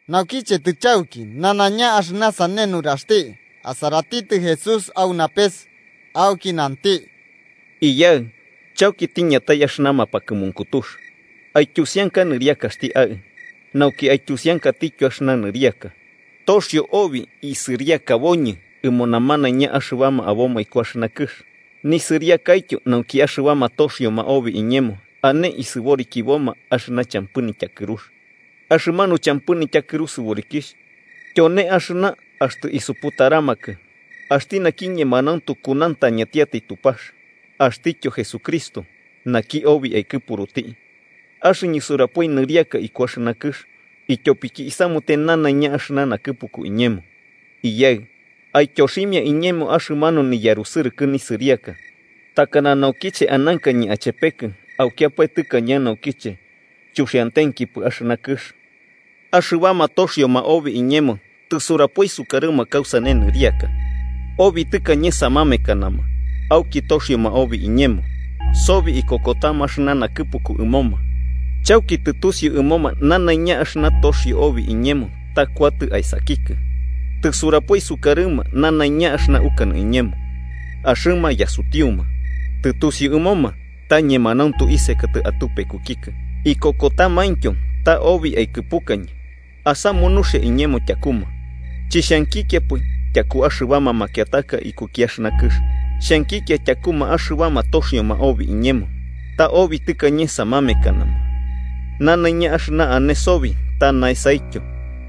Naukiche tɨchauki nanaiña axɨna sane nuraxti, asaratitɨ Jesús au napes, auki nanti: “Iyaɨ, chauki tiñatai axɨna mapakɨmunkutux. Aityusianka nɨriakaxti Aɨ, nauki aityusiankatityo axɨna nɨriaka. Toxio obi isɨriakaboñɨ ɨmoma namanaiña axɨbama aboma iku axɨna kɨx, nisɨriakaityo nauki axɨbama toxioma obi iñemo ane isɨborikiboma axɨna champɨ nityakɨrux. Axɨmanu champɨ nityakɨru sɨborikixh tyone axɨna axtɨ isuputaramakɨ, axti naki ñemanauntu kunauntañatiatai Tupax, axtityo Jesucristo, naki obi aikɨpuruti. Axɨñɨ surapoi nɨriaka iku axɨna kɨx, ityopiki isamute nanaiña axɨna nakɨpuku iñemo. Iyaɨ, aityoximia iñemo axɨmanu niyarusɨrɨkɨ nisɨriaka takana naukiche anankañɨ achepekɨ aukiapae tɨkañe naukiche chuxiantenkipɨ axɨna kɨx. “Axɨbama toxioma obi iñemo tɨsurapoi sukarɨma kausane nɨriaka. Obi tɨkañe samekanama, auki toxioma obi iñemo, sobi ikokotama axɨna nakɨpuku ɨmoma. Chauki tɨtusiu ɨmoma nanaiña axɨna toxio obi iñemo ta kuatɨ aesakikɨ. Tɨsurapoi sukarɨma nanaiña axɨna ukanɨ iñemo, axɨma yasutiuma. Tɨtusiu ɨmoma ta ñemanauntu isekatɨ atupekukikɨ, ikokotamaintyo ta obi aikɨpukañɨ. “Asamu nuxia iñemo tyakuma. Chixhankikiapɨ tyaku axɨbama makiataka ikuki axɨna kɨx, xhankikia tyakuma axɨbama toxioma obi iñemo, ta obi tɨkañe samamekanama. Nanaiña axɨna ane sobi ta naesaityo,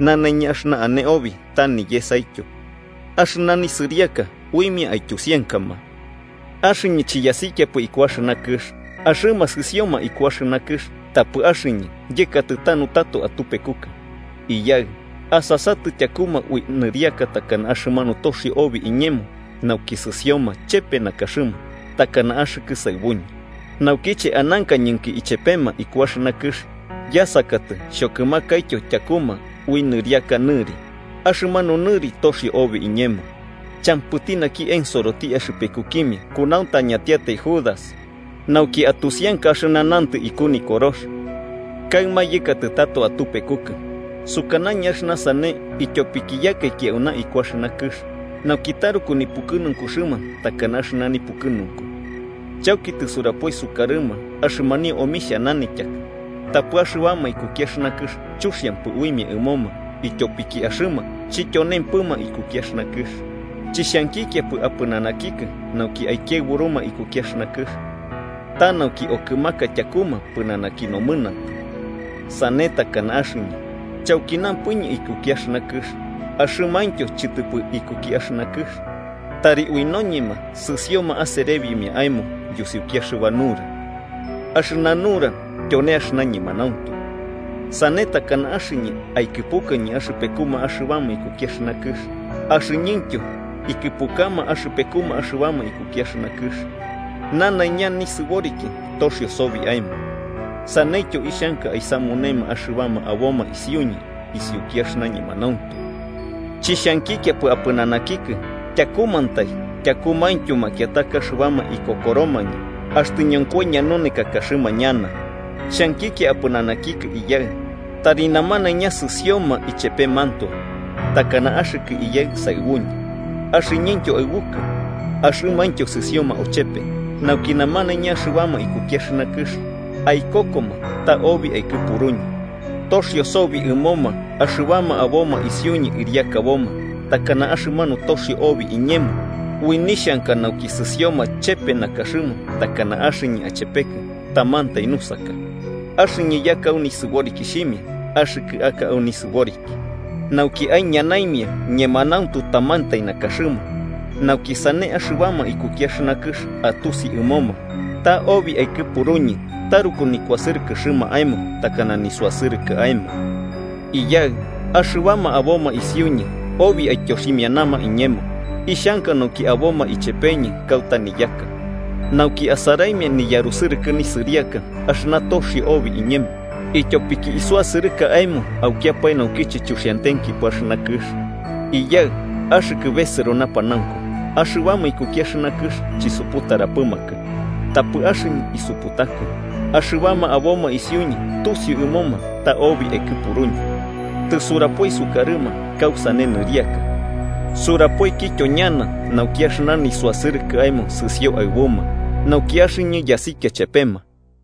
nanaiña axɨna ane obi ta niyesaityo. Axɨna nisɨriaka uimia aityusiankama. “Axɨñɨ chiyasikiapɨ iku axɨna kɨx, axɨma sɨsioma iku axɨna kɨx tapɨ axɨñɨ yɨkatɨ tanu tato atupekukɨ. Iyaɨ, asasatɨ tyakuma ui nɨriaka takana axɨmanu toxio obi iñemo nauki sɨsioma chepe nakaxɨma, takana axɨkɨ saɨbuñɨ. Naukiche anankañɨnki ichepema iku axɨna kɨx, yasakatɨ xhokɨmakaityo tyakuma ui nɨriaka nɨri, axɨmanu nɨri toxio obi iñemo. Champɨti naki ensoroti axɨpekukimia kunauntañatiatai Judas, nauki atusianka axɨna nantɨ iku Nikorox. “Kaɨma yɨkatɨ tato atupekukɨ. Sukanañɨ axɨna sane ityopiki yakaiki auna iku axɨna kɨx, nauki taruku nipukɨnunkuxɨma takana axɨna nipukɨnunku. Chauki tɨsurapoi sukarɨma axɨmanio omixhia nanityaka, tapɨ axɨbama ikuki axɨna kɨx chuxiampɨ uimia ɨmoma ityopiki axɨma chityonempɨma ikuki axɨna kɨx. Chixhankikiapɨ apɨnanakikɨ nauki aikiaɨburuma ikuki axɨna kɨx, ta nauki okɨmaka tyakuma pɨnanaki nomɨnantɨ. Sane takana axɨñɨ chaukinampɨñɨ ikuki axɨna kɨx, axɨmaintyo chɨtɨpɨ ikuki axɨna kɨx. Tari ui noñema sɨsoma aserebimia aemo yusiuki axɨba nura. Axɨna nura tyone axɨna ñemanauntu. Sane takana axɨñɨ aikɨpukañɨ axɨpekuma axɨbama ikuki axɨna kɨx, axɨñɨntyo ikɨpukama axɨpekuma axɨbama ikuki axɨna kɨx. Nanaiña nisɨboriki toxio sobi aemo, saneityo ixhanka aisamunema axɨbama aboma isiuñɨ isiuki axɨna ñemanauntu. “Chixhankikiapɨ apɨnanakikɨ tyakumantai, tyakumaintyo makiataka axɨbama ikokoromañɨ axtɨ ñonkoi ñanunekakaxɨma ñana. Xhankikia apɨnanakikɨ Iyaɨ, tari namanaiña sɨsioma ichepemantoe. Takana axɨkɨ Iyaɨ saɨbuñɨ, axɨñɨntyo aɨbukɨ, axɨmaintyo sɨsioma ochepe, nauki namanaiña axɨbama ikuki axɨna kɨx aikokoma ta obi aikɨpuruñɨ. Toxio sobi ɨmoma axɨbama aboma isiuñɨ ɨriakaboma takana axɨmanu toxio obi iñemo, ui nixhanka nauki sɨsioma chepe nakaxɨma takana axɨñɨ achepekɨ tamantai nusaka. Axɨñɨ yaka au nisɨborikixhimia axɨkɨ aka au nisɨboriki, nauki aiñanaimia ñemanauntu tamantai nakaxɨma, nauki sane axɨbama ikuki axɨna kɨx atusi ɨmoma ta obi aikɨpuruñɨ, taruku nikuasɨrɨkɨxɨma aemo takana nisuasɨrɨkɨ aemo. “Iyaɨ, axɨbama aboma isiuñɨ obi aityoximianama iñemo, ixhanka nauki aboma ichepeñɨ kauta niyaka, nauki asaraimia niyarusɨrɨkɨ nisɨriaka axɨna toxio iñemo obi, ityopiki isuasɨrɨka aemo aukiapae naukiche chuxiantenkipɨ axɨna kɨx. Iyaɨ axɨkɨ besɨro napanaunku, axɨbama ikuki axɨna kɨx chisuputaramapɨkɨ. Tapɨ axɨñɨ isuputakɨ, axɨbama aboma isiuñɨ tusiu ɨmoma ta obi aikɨpuruñɨ. Tɨsurapoi sukarɨma kausane nɨriaka, surapoikityo ñana, nauki axɨna nisuasɨrɨkɨ aemo sɨsio aɨbuma, nauki axɨñɨ yasikia chepema.”